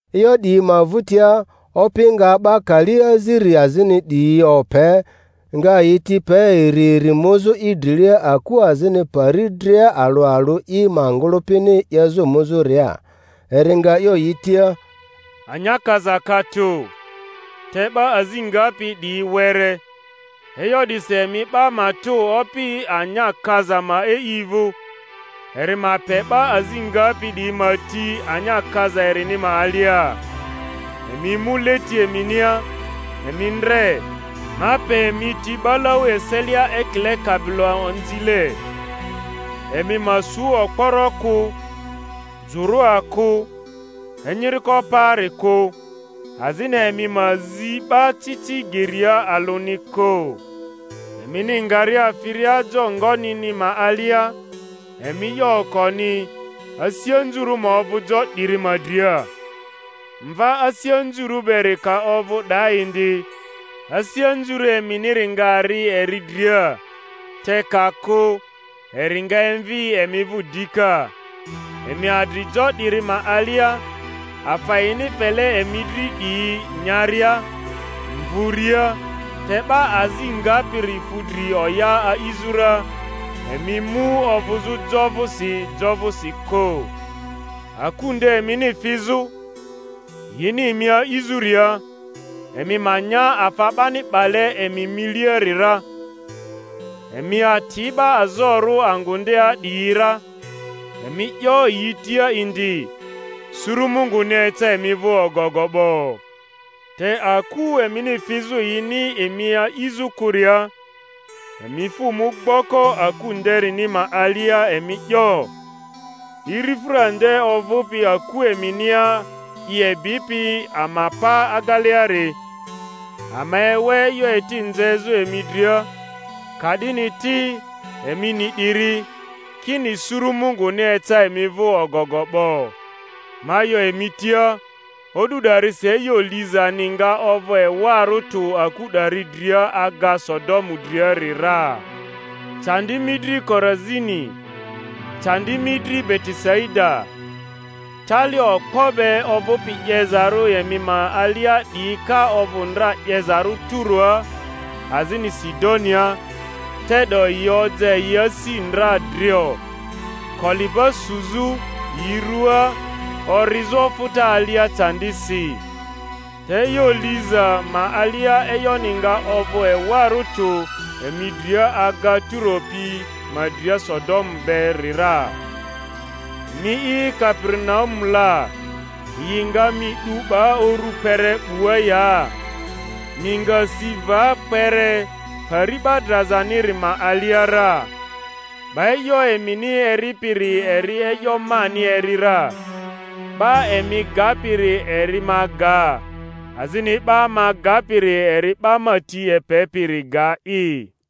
E'yo 'diyi ma vᴜtia, Opi nga'ba kali aziri azini 'diyiope, ngayi ti pe iri iri muzᴜ i drilia aku azini pari dria alᴜ alᴜ i ma ngᴜlᴜpini 'yezᴜ muzᴜria. Eri nga 'yo yi tia, Anya kaza ka tᴜ, te 'ba azi ngapi 'diyi were; e'yo 'disi emi 'ba matᴜ Opi anya kaza ma e'i vᴜ, eri ma pe 'ba azi ngapi 'diyi ma ti anya kaza erini ma alia. Emi mu leti eminia; emi ndre, ma pe emi ti 'balau eselia ekile kabiloanzile. Emi ma su okporo kᴜ, jᴜrᴜa kᴜ, enyiriko paari kᴜ; azini emi ma zi 'ba ci ci geria alᴜni kᴜ. Emini ngaria firia jo ngonini ma alia, emi 'yo okoni, Asi anzurᴜ ma ovᴜ jo 'diri ma dria! Mva asi anzurᴜ beri ka ovᴜ 'daa indi, asi anzurᴜ eminiri nga ri eri dria; te ka kᴜ, eri nga emvi emi vᴜ dika. Emi adri jo 'diri ma alia, afa yini fele emi dri 'diyi nyaria, mvuria, te 'ba azi ngapiri fu dri oya a'izᴜ ra; emi mu ovᴜzᴜ jo vᴜsi jo vᴜsi kᴜ. Aku nde emini fizᴜ, yini emi a'izᴜria, emi ma nya afa 'bani 'bale emi miliari ra; emi ati 'ba azorᴜ angᴜ ndea 'diyi ra, emi 'yo yi tia indi, Suru Munguni eca emi vᴜ ogogo 'bo. Te aku emini fizᴜ yini emi aizᴜ kᴜria, emi fᴜ mu gboko aku ndeniri ma alia, emi 'yo, Irifᴜra nde ovᴜpi aku eminia i ebipi ama pa ageleari, ama ewe e'yo eti nzezu emi dria; ka' dini ti, emi ni 'diri, kini, suru Munguni eca emi vᴜ ogogo 'bo. Ma 'yo emi tia, O'du 'darisi e'yo lizani nga ovᴜ ewarᴜ tᴜ aku 'dari dria aga Sodomu driari ra. Candi mi dri, Korazini! candi mi dri, Betesaida! tali okpo be ovᴜpi 'yezarᴜ emi ma alia 'diyi ka ovᴜ ndra 'yezarᴜ Turoa azini Sidonia, te'do yi oja yi asi ndra drio, koliba suzᴜ yi ruaa orizᴜ ofᴜta alia candisi. Te e'yo liza ma alia e'yoni nga ovᴜ ewarᴜ tᴜ emi dria aga Turo pi ma dria Sodomu beri ra. Mi'i Kaperinaumu la, yi nga mi 'du 'ba uru kpere 'bua ya? Mi nga si va kpere Pari 'ba drazaniri ma alia ra. 'Ba e'yo emini eripiri eri e'yo mani eri ra, 'ba emi gapiri eri ma ga, azini 'ba ma gapiri eri 'ba ma ti epepiri ga'i.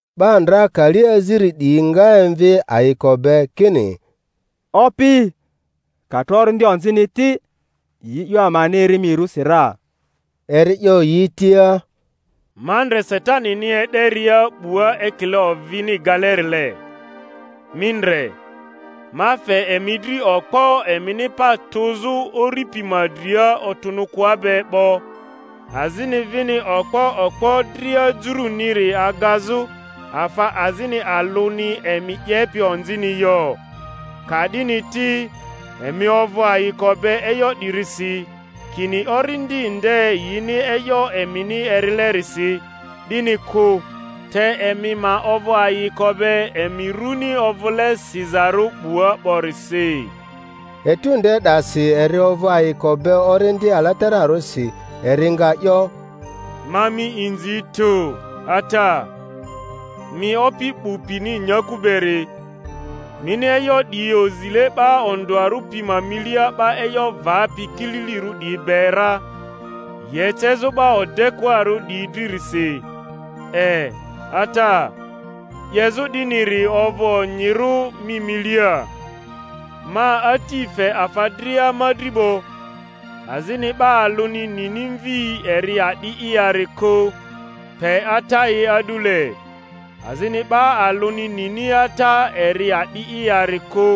'Ba ndraka kali aziri 'diyi nga emvi ayiko be, kini, Opi, ka tro orindi onzini ti, yi e'yo amani eri mi rusi ra! Eri 'yo yi tia, Ma ndre Satanini e'deria 'bua ekile ovini galerile. Mi ndre, ma fe emi dri okpo emini pa tᴜzᴜ uri pi ma dria otᴜnᴜkᴜa be 'bo, azini vini okpo okpo dria juruniri agazᴜ; afa azini alᴜni emi 'yepi onzini yo. Ka-'dini ti, emi ovᴜ ayiko be e'yo 'dirisi, kini orindi nde yini e'yo emini erilerisi, 'dini kᴜ; te emi ma ovᴜ ayiko be emi runi ovᴜle sizarᴜ 'bua 'borisi. Etu nde 'dasi eri ovᴜ ayiko be Orindi Alatararᴜsi, eri nga 'yo, Ma mi inzi tᴜ, Ata, mi Opi 'bu pini nyaku beri, mini e'yo 'diyi ozile 'ba ondᴜarᴜ pi ma milia 'ba e'yo vapi kililirᴜ 'diyi be ra, yi ecezᴜ 'ba odekᴜarᴜ 'diyi dririsi; e, Ata, 'yezᴜ 'diniri ovᴜ onyiro mi milia. Ma Ati fe afa dria ma dri 'bo; azini 'ba alᴜni nini Mvi eri a'di'i yari kᴜ pe Ata'i a'dule, azini 'ba alᴜni nini Ata eri a'di'i yari kᴜ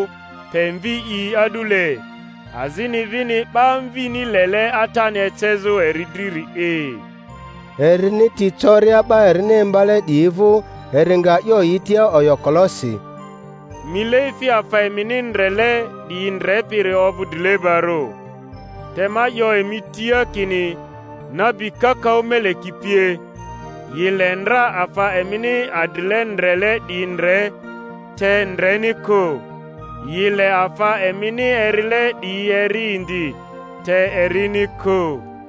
pe Mvi'i a'dule, azini vini 'ba Mvini lele Atani ecezᴜ eri driri'i. Erini ti coria 'ba erini imbale 'diyi vᴜ, eri nga 'yo yi tia oyokolosi, Mileefi afa emini ndrele 'diyi ndrepiri ovᴜ drilebarᴜ! Te ma 'yo emi tia kini, nabi kakaᴜ meleki pie, yi le ndra afa emini adrile ndrele 'diyi ndre, te ndreni kᴜ; yi le afa emini erile 'diyi eri indi, te erini kᴜ.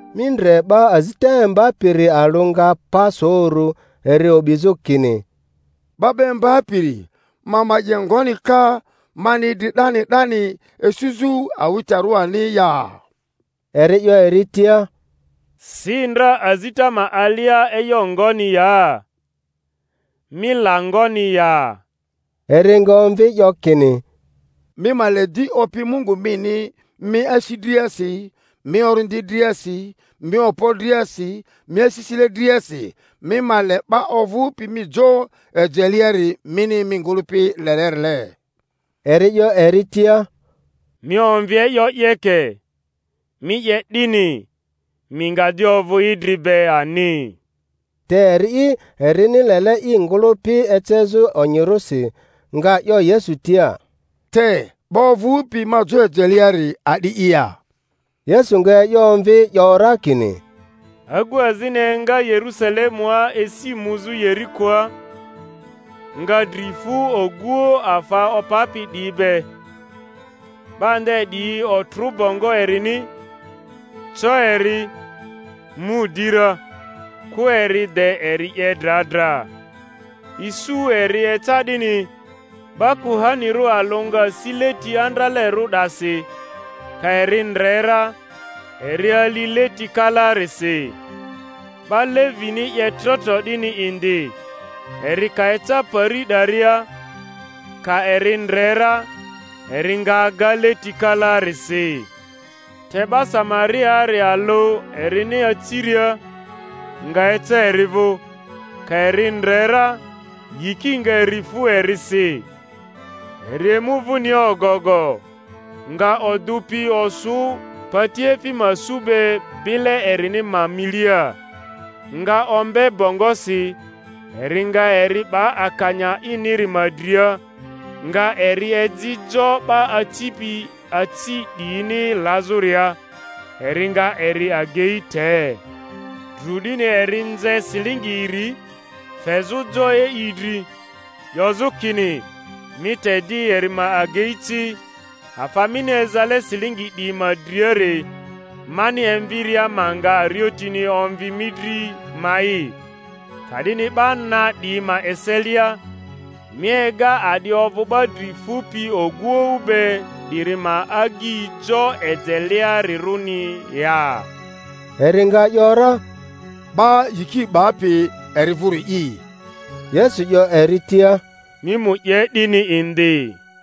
Mi ndre, 'ba azita imbapiri alᴜ nga pa so uru, eri o'bizᴜ kini, 'Ba 'ba Imbapiri, ma ma 'ye ngoni ka, mani idri 'dani 'dani isuzᴜ awitarᴜ ani ya? Eri 'yo eri tia, Si ndra azita ma alia e'yo ngoni ya? Mi la ngoni ya? Eri nga omvi 'yo kini, Mi ma le di Opi Mungu mini mi asi driasi, mi orindi driasi, mi okpo driasi, mi asisile driasi; mi ma le 'ba ovᴜpi mi jo ejeleari mini mi ngᴜlᴜpi lelerile. Eri 'yo eri tia, Mi omvi e'yo 'yeke; mi 'ye 'dini, mi nga di ovᴜ idri be ani. Te eri'i, erini lele i ngᴜlᴜpi ecezᴜ onyirᴜsi, nga 'yo Yesu tia, Te 'ba ovᴜpi ma jo ejeleari a'di'i ya? Yesu nga e'yo omvi, 'yo ra kini, Agu azini enga Yerusalemua esi muzᴜ Yerikoa; nga dri fu oguoᴜ afa opapi 'diyi be. 'Ba nde 'diyi otrᴜ bongo erini, co eri, mu di ra, kᴜ eri de eri 'ye dra dra. Isu eri eca 'dini, 'ba kuhanirᴜ alᴜ nga si leti andralerᴜ 'dasi; ka eri ndre ra, eri ali leti kalaarisi. 'Ba Levini 'ye trotro 'dini indi, eri ka eca pari 'daria, ka eri ndre ra, eri nga aga leti kalaarisi. Te 'ba Samariaari alᴜ erini aciria, nga eca eri vᴜ; ka eri ndre ra, yiki nga eri fu erisi, eri emu vᴜnia ogogo, nga odᴜ pi osᴜ patiefi ma su be bile erini ma milia, nga ombe bongosi; eri nga eri 'ba akanya iniri ma dria, nga eri eji jo 'ba acipi aci 'diyini lazᴜria, eri nga eri agei te. Dru 'dini eri nze silingi iri, fezᴜ jo e'i dri, 'yozᴜ kini, Mi te di eri ma agei ci; afa mini ezale silingi 'diyi ma driari, mani emviria ma nga ariotini omvi mi dri ma'i. Ka'dini 'ba na 'diyi ma eselia, mi ega a'di ovᴜ 'ba dri fupi oguoᴜ be 'diri ma agyi jo ejelearirᴜni ya? Eri nga ‘yora, 'Ba yiki 'bapi eri vᴜri'i. Yesu 'yo eri tia, Mi mu 'ye 'dini indi.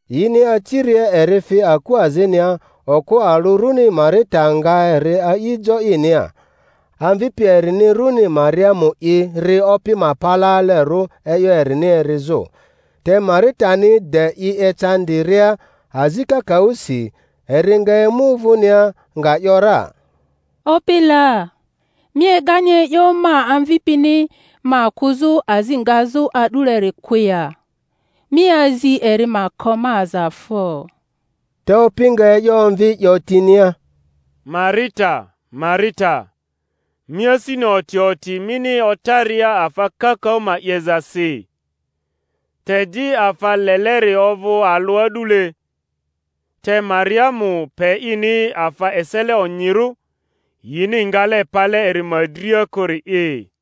Yini aciria eri fi aku azinia; okᴜ alᴜ runi Marita nga eri a'i jo inia. Amvipi erini runi Mariamu'i ri Opi ma palaalerᴜ e'yo erini erizᴜ. Te Maritani de i ecandi- ria azi kakaᴜsi, eri nga emu vᴜnia, nga ‘yora, Opi la, mi egani e'yo ma amvipini ma kᴜzᴜ azi ngazᴜ a'duieri kᴜ ya? Mi azi eri ma ko ma aza fo. Te Opi nga e'yo omvi, 'yo tinia, Marita, Marita, mi asini oti oti mini otaria afa kakaᴜ ma 'yezasi; te di afa leleri ovᴜ alᴜ a'dule. Te Mariamu pe ini afa esele onyirᴜ, yini ngale pale eri ma dria kᴜri'i.